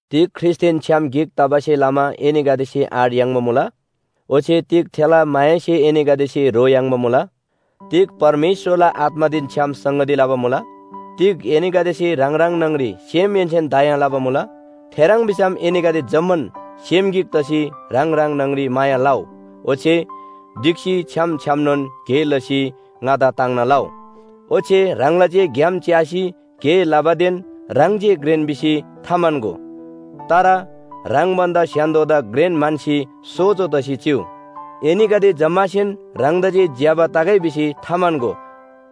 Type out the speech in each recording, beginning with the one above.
तिग ख्रीष्‍टदेन छ्‌याम गिक तबासे लमा एनीगदेसे आँट याङ्बा मुला? ओच्‍छे तिग थेला मायासे एनीगदेसे ह्रो याङ्बा मुला? तिग परमेश्‍वरला आत्‍मादेन छ्‌याम संगती लबा मुला? तिग एनीगदेसे ह्राङ ह्राङ न्‍हङरी सेमहेन्‍सेन दया लबा मुला? थेह्रङ् भिसम एनीगदे जम्‍मान सेम गिक तसी ह्राङ ह्राङ न्‍हङरी माया लउ, ओच्‍छे ढिक्‍सी छ्‌याम छ्‌यामनोन गे लसी ङादा ताङ्ना लउ। ओच्‍छे ह्राङला जे ग्‍याम च्‍यासी गे लबादेन ह्राङ जे घ्रेन भिसी थाम्‍हन्‍गो। तर ह्राङ भन्‍दा स्‍य्‍हान्‍दोदा घ्रेन म्‍हन्‍सी सोजो तसी चिउ। एनीगदे जम्‍मासेन ह्राङदा जे ज्‍यबा तगै भिसी थाम्‍हन्‍गो।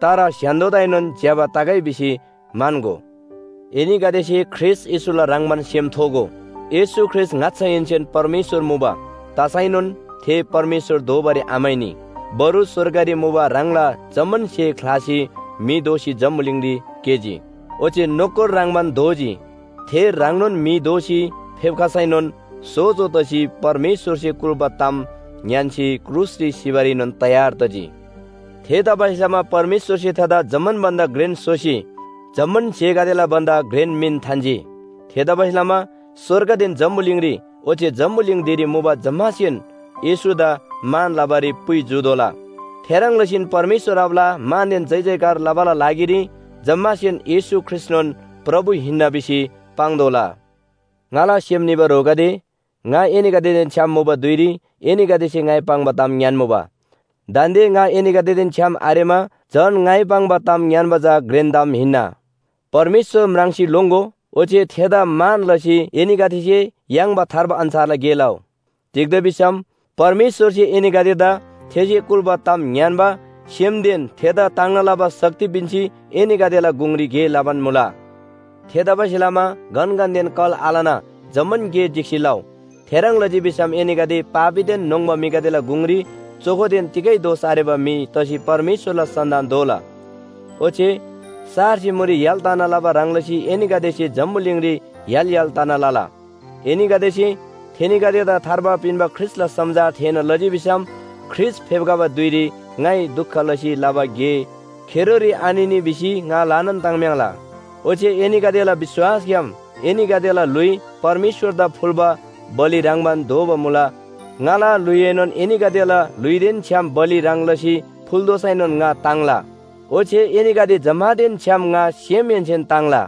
तर स्‍य्‍हान्‍दोदाएनोन ज्‍यबा तगै भिसी म्‍हन्‍गो। एनीगदेसे ख्रीष्‍ट येशूला ह्रङ्‌बान सेम थोगो। येशू ख्रीष्‍ट ङाच्‍छाहेन्‍सेन परमेश्‍वर मुबा। तसैनोन थे परमेश्‍वर दोबारी आम्‍हाइनी। बरु स्‍वर्गरी मुबा ह्राङला जम्‍मान स्‍हे ख्‍लासी म्‍हि दोसी जम्‍बुलिङरी केजी। ओच्‍छे नोकर ह्रङ्‌बान दोजी। थे ह्राङनोन म्‍हि दोसी फेप्‍खसैनोन सोजो तसी परमेश्‍वरसे कुल्‍बा ताम ङ्‌यान्‍सी क्रुसरी सिबारीनोन तयार तजी। थेतबासेलमा परमेश्‍वरसे थेदा जम्‍मान भन्‍दा घ्रेन स्‍होसी जम्‍मान स्‍हेगदेला भन्‍दा घ्रेन मिन थान्‍जी। थेतबासेलमा स्‍वर्गदेन जम्‍बुलिङ ओच्‍छे जम्‍बुलिङ धिरी मुबा जम्‍मासेन येशूदा मान लबारी पुइ जूतोःला। थेह्रङ् लसीन परमेश्‍वर आबाला मानदेन जयजयकार लबाला लागिरी जम्‍मासेन येशू ख्रीष्‍टनोन प्रभु हिन्‍ना भिसी पाङ्तोःला। ङाला सेम निबा ह्रोगदे, ङा एनीगदेदेन छ्‌याम मुबा धुइरी एनीगदेसे ङाइ पाङ्बा ताम ङ्‌यान्‍मुबा। दान्‍दे ङा एनीगदेदेन छ्‌याम आरेमा झन ङाइ पाङ्बा ताम ङ्‌यान्‍बा चा घ्रेन ताम हिन्‍ना। परमेश्‍वर म्राङ्सी लोङ्‍गो ओच्‍छे थेदा मान लसी एनीगदेसे याङ्बा थार्बा अन्‍छारला गे लउ। तिग्‍दा भिसम परमेश्‍वरसे एनीगदेदा थेसे कुल्‍बा ताम ङ्‌यान्‍बा सेमदेन थेदा ताङ्ना लबा शक्ति पिन्‍सी एनीगदेला गुङरी गे लबान मुला। थेतबासेलमा गनगनदेन कल आलना जम्‍मान गे ढिक्‍सी लउ। थेह्रङ् लजी भिसम एनीगदे पापीदेन न्‍होङ्बा म्‍हिगदेला गुङरी चोखोदेन तिगै दोष आरेबा म्‍हि तसी परमेश्‍वरला सन्‍तान दोला। ओच्‍छे सारसे मुरी य्‍हाल तना लबा ह्रङ् लसी एनीगदेसे जम्‍बुलिङरी य्‍हाल य्‍हाल तना लला। एनीगदेसे थेनीगदेदा थार्बा पिन्‍बा ख्रीष्‍टला समाचार थेःना लजी भिसम ख्रीष्‍ट फेप्‍खबा धुइरी ङाइ दुख लसी लबा गे खेरोरी आनिनी भिसी ङा ल्‍हानान ताङ्म्‍याङ्ला। ओच्‍छे एनीगदेला विश्‍वासग्‍याम एनीगदेला ल्‍हुइ परमेश्‍वरदा फुल्‍बा बलि ह्रङ्‌बान दोबा मुला। ङाला ल्‍हुइएनोन एनीगदेला ल्‍हुइदेन छ्‌याम बलि ह्रङ् लसी फुल्‍तोःसैनोन ङा ताङ्ला। ओच्‍छे एनीगदे जम्‍मानदेन छ्‌याम ङा सेमहेन्‍सेन ताङ्ला।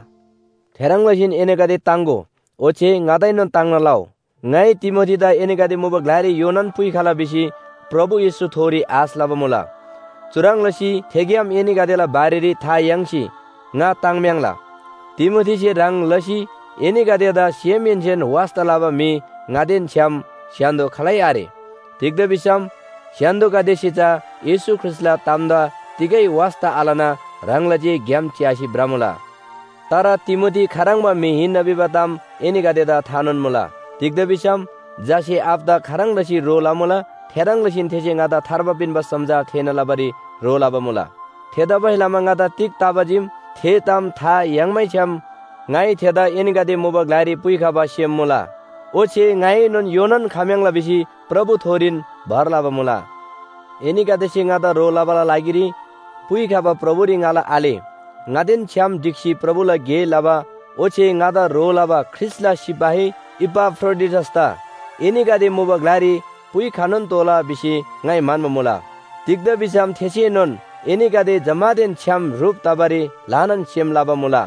थेह्रङ् लसीन एनीगदे ताङ्‍गो, ओच्‍छे ङादाएनोन ताङ्ना लउ। ङाइ तिमोथीदा एनीगदे मुबा ग्‍लारी योनान पुइखला भिसी प्रभु येशूथोरी आश लबा मुला। चुह्रङ् लसी थेग्‍याम एनीगदेला बारेरी था याङ्सी ङा ताङ्म्‍याङ्ला। तिमोथीसे ह्रङ् लसी एनीगदेदा सेमहेन्‍सेन वास्‍ता लबा म्‍हि ङादेन छ्‌याम स्‍य्‍हान्‍दो खालै आरे। तिग्‍दा भिसम स्‍य्‍हान्‍दोगदेसे चा येशू ख्रीष्‍टला तामदा तिगै वास्‍ता आलना ह्राङला जे ग्‍याम च्‍यासी भ्रमुला। तर तिमोथी खाह्रङ्बा म्‍हि हिन्‍ना भिबा ताम एनीगदेदा थानोन मुला। तिग्‍दा भिसम झासे आबादा खाह्रङ् लसी ह्रो लमुला थेह्रङ् लसीन थेसे ङादा थार्बा पिन्‍बा समाचार थेःना लबारी ह्रो लबा मुला। थेतबासेलमा ङादा तिग तबा चीम, थे ताम था याङ्मैछ्‌याम ङाइ थेदा एनीगदे मुबा ग्‍लारी पुइखबा सेम मुला। ओच्‍छे ङाएनोन योनान खम्‍याङ्ला भिसी प्रभुथोरीन भर लबा मुला। एनीगदेसे ङादा ह्रो लबाला लागिरी पुइखबा प्रभुरी ङाला आले, ङादेन छ्‌याम ढिक्‍सी प्रभुला गे लबा ओच्‍छे ङादा ह्रो लबा ख्रीष्‍टला सिपाही इपाफ्रोडिटसदा एनीगदे मुबा ग्‍लारी पुइखनोन तोःला भिसी ङाइ म्‍हन्‍बा मुला। तिग्‍दा भिसम थेसेनोन एनीगदे जम्‍मानदेन छ्‌याम ह्रुप तबारी ल्‍हानान सेम लबा मुला।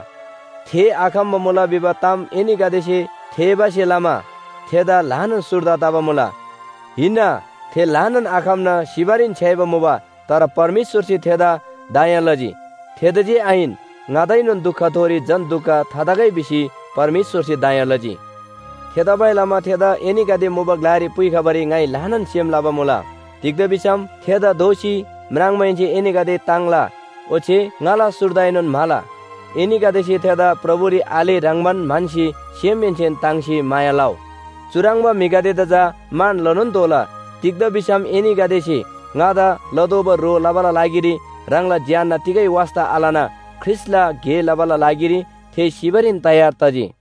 थे आखम्‍बा मुला भिबा ताम एनीगदेसे थेःबासे लमा थेदा ल्‍हानान सुर्दा तबा मुला। हिन्‍ना, थे ल्‍हानान आखम्‍ना सिबारीन छ्‌याइमुबा तर परमेश्‍वरसे थेदा दया लजी। थेदा जे आहिन, ङादाएनोन दुखथोरी झन दुख थातगै भिसी परमेश्‍वरसे दया लजी। थेतबासेलमा थेदा एनीगदे मुबा ग्‍लारी पुइखबारी ङाइ ल्‍हानान सेम लबा मुला। तिग्‍दा भिसम थेदा दोःसी म्राङ्माहेन्‍से एनीगदे ताङ्ला ओच्‍छे ङाला सुर्दाएनोन म्‍हाला। एनीगदेसे थेदा प्रभुरी आले ह्रङ्‌बान म्‍हन्‍सी सेमहेन्‍सेन ताङ्सी माया लउ। चुह्रङ्बा म्‍हिगदेदा चा मान लनोन तोःला। तिग्‍दा भिसम एनीगदेसे ङादा लतोःबा ह्रो लबाला लागिरी ह्राङला ज्‍यान्‍ना तिगै वास्‍ता आलना ख्रीष्‍टला गे लबाला लागिरी थे सिबारीन तयार तजी।